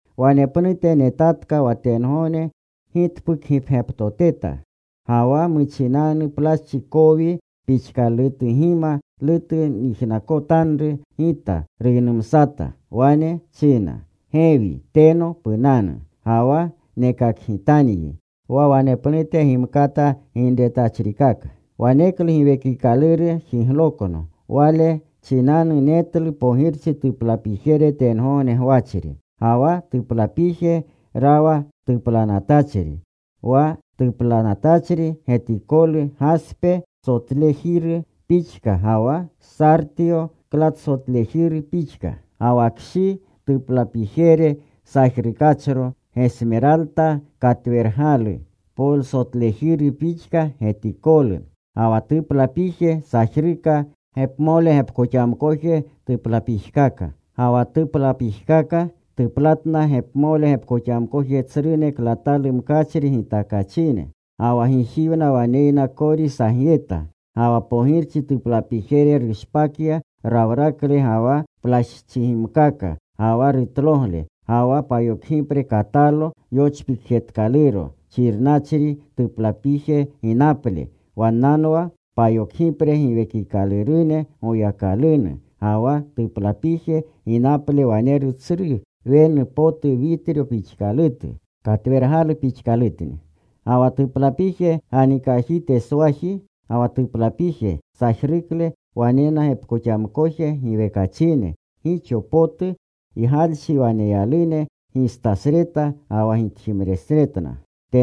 Wanepnute netatka wa tengogne gitpukgipgyaptoteta. Ga wa muchinanu plaschi kowi pixkagimalutu nyijnakotanru. Gita ruynumsata. Wane china, “Gewi teno punanu. Ga wa nekakgitanyi wa wanepnute gimkata ginretachrikaka.” Waneklu Giwekikaluru jiglokno. Wale chinanu netlu pogirchi tuplapijere tengogne gwachri. Ga wa tuplapije rawa tuplanatachri. Wa tuplanatachri getikolu gaspe sotlejiru pixka ga wa sartiyo klatalsotlejiru pixka. Ga wa kshi tuplapije sajrukachro, gesmeralta katwergalu polersotlejiru pixka getikolu. Ga wa tuplapije sajruka gepmole gepkoxamkoje tuplapijkaka. Ga wa tuplapijkaka tuplatna gepmole gepkoxamkoje tsrune klatalu mkachri gitakachine. Ga wa gijiwna waneyna kori sagyeta. Ga wa pogirchi tuplapijere rushpakya rawrakle ga wa plaschigimkaka, ga wa rutlogle. Ga wa payokgipre katalo yochpikjetkaluro xirnachri tuplapije ginaple. Wannanwa payokgipre giwekikalurune Goyakalunu. Ga wa tuplapije ginaple waneru tsru wenu potu witryo pixkalutu. Katwergalu pixkalutni. Ga wa tuplapije ganikajiteswaji ga wa tuplapije sajrukle wanena gepkoxamkoje gepkoxamkoje giwekachine, gixo potu ygalchi waneyalune gistasreta ga wa gitjimnesretna.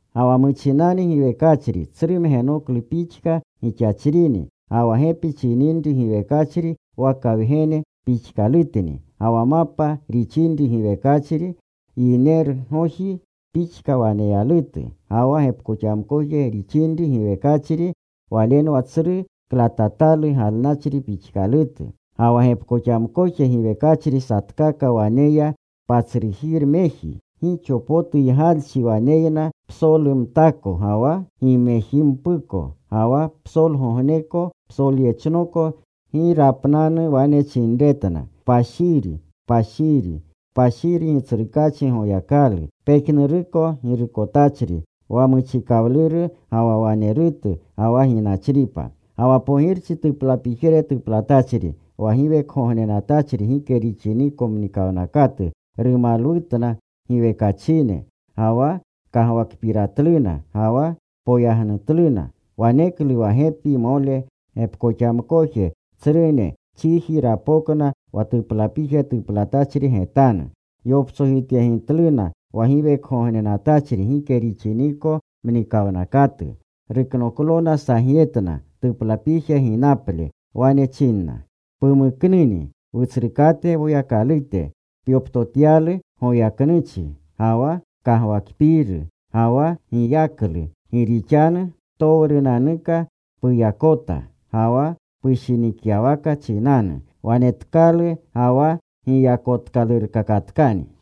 Ga wa muchinanu giwekachri, tsru mgenoklu pixka gixachrini. Ga wa gepi rixinri giwekachri waka wgene pixkalutni. Ga wa mapa rixinri giwekachri, yinerugoji pixka waneyalutu. Ga wa gepkoxamkoje rixinri giwekachri walenwa tsru klatatalu galnachri pixkalutu. Ga wa gepkoxamkoje giwekachri satkaka waneya patsrujiremeji. Gixo potu ygalchi waneyna psolumtako ga wa gimejimpuko. Ga wa psolgogneko psolyechnoko gi rapnanu wane chinretna: Kpashiri, kpashiri, kpashiri Gitsrukaachi Goyakalu, pejnuruko Girukotachri, wa muchikawluru ga wa wanerutu ga wa ginachripa. Ga wa pogirchi tuplapijere tuplatachri, wa giwekgognenatachri gike rixiniko mnikawnakatu rumalwutna giwekachine, ga wa kagwakpiratluna, ga wa poyagnutluna. Waneklu wa gepimole gepkoxamkoje tsrune chiji rapokna wa tuplapije tuplatachri getanu. Yoptsojityegitluna wa giwekgognenatachri gike rixiniko mnikawnakatu. Ruknoklona sagyetna tuplapije ginaple. Wane chinna: Pumuknuni, Wutsrukate Woyakalute, pyoptotyalu goyaknuchi ga wa kagwakpiiru, ga wa giyaklu gi rixanu ptowrunanuka puyakota. Ga wa pushinikyawaka chinanu wanetkalu ga wa giyakotkalurutkani.